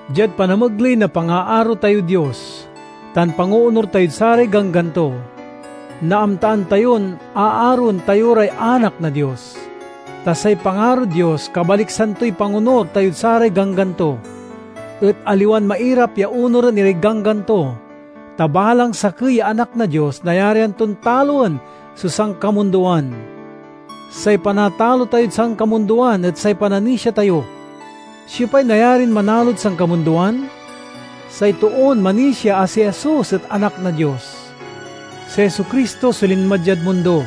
Diad panamegley na pangaaro tayod Dios tan pangoonur tayod saray ganggan to, naamtaan tayon a aroen tayo ray anak na Dios. Ta say pangarod Dios kabaliksan toy pangonur tayod saray ganggan to. Et aliwan mairap ya onuren iray ganggan to, ta balang sakey ya anak na Dios nayarian ton taloen so sankamundoan. Say panatalo tayod sankamundoan et say pananisia tayo. Siopay nayarin manalod sankamundoan? Say toon manisia a si Jesus et Anak na Dios. Si Jesu-Cristo so linma diad mundo,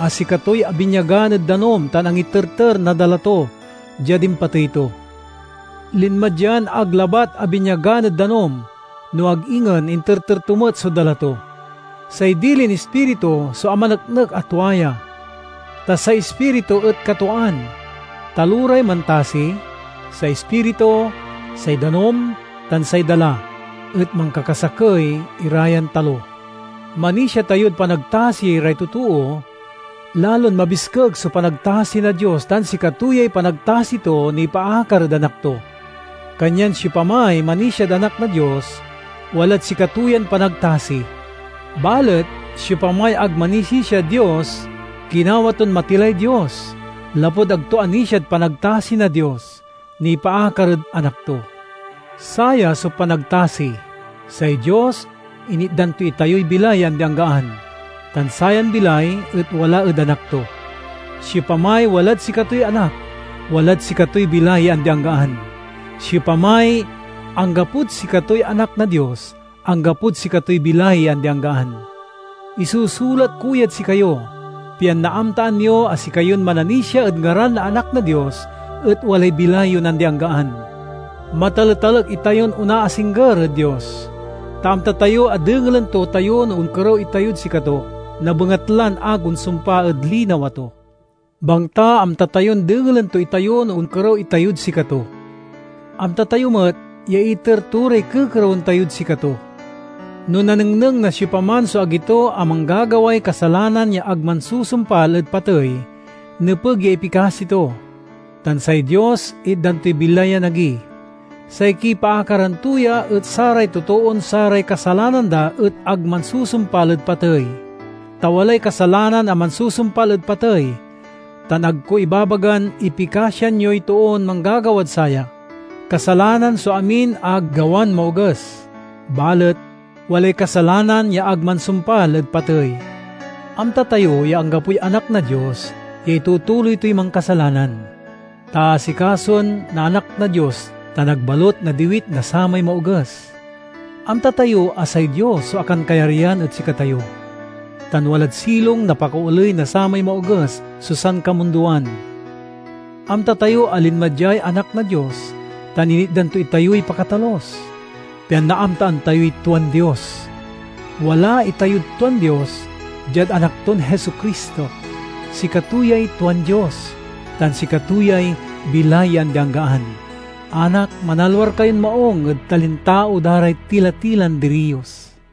a sikatoy abinyagan ed danum tan angiterter na dala to diad impatey to. Linma dian ag labat abinyagan ed danum, no ag ingen interter to met so dala to. Say dilin Ispiritu so amaneknek a tua ya, ta say Ispiritu et katwaan. Taloray mantasi: say Ispiritu, say danum, tan say dala; et mankakasakey ira yan talo. Manisia tayod panagtasi ray totoo; lalon mabiskeg so panagtasi na Dios tan sikato yay panagtasi to nipaakar ed Anak to. Kanyan siopamay manisiad Anak na Dios, walad sikato yan panagtasi. Balet siopamay ag manisisiad Dios, ginawa ton matilay Dios lapud ag to anisiad panagtasi na Dios nipaakar ed Anak to. Saya so panagtasi: say Dios initdan to itayoy bilay ya andi-anggaan, tan sayan bilay et wala ed Anak to. Siopamay walad sikatoy Anak, walad sikatoy bilay ya andi-anggaan; siopamay anggapod sikatoy Anak na Dios, anggapod sikatoy bilay ya andi-anggaan. Isusulat ko yad sikayo, pian naamtaan yo a sikayon mananisia ed ngaran na Anak na Dios et walay bilay yon andi-anggaan. Mataletalek itayon onaasingger ed Dios, ta amta tayo a dengelen to tayo no onkerew itayod sikato na bengatlan ag onsumpa ed linawa to. Bangta amta tayon dengelen to itayo no onkerew itayod sikato, amta tayo met ya iter to ray kekerewen tayod sikato. No nanengneng na siopaman so agi to a manggagaway kasalanan ya ag mansusumpal ed patey, nepeg ya ipikasi to, tan say Dios itdan toy bilay yan agi. Say kipaakaran to ya et saray totoon saray kasalanan da et ag mansusumpal ed patey. Ta walay kasalanan a mansusumpal ed patey, tan ag ko ibabagan ipikasian yoy toon manggagawad saya. Kasalanan so amin a gawan maoges, balet walay kasalanan ya ag mansumpal ed patey. Amta tayo ya anggapoy anak na Dios ya itutuloy toy mankasalanan, ta aasikasoen na Anak na Dios, tan ag balut nadiwit na samay Maoges. Amta tayo a say Dios so akankayaryan ed sikatayo, tan walad silong na pakaoley na samay Maoges so sankamundoan. Amta tayo a linma diay Anak na Dios tan initdan to itayoy pakatalus, pian naamtaan tayoy tuan Dios. Wala itayod tuan Dios—diad Anak ton Jesu-Cristo. Sikato yay tuan Dios, tan sikato yay bilay ya andi-anggaan. Anak, manalwar kayon maung ed talintao da ray tila-tilan diriyos!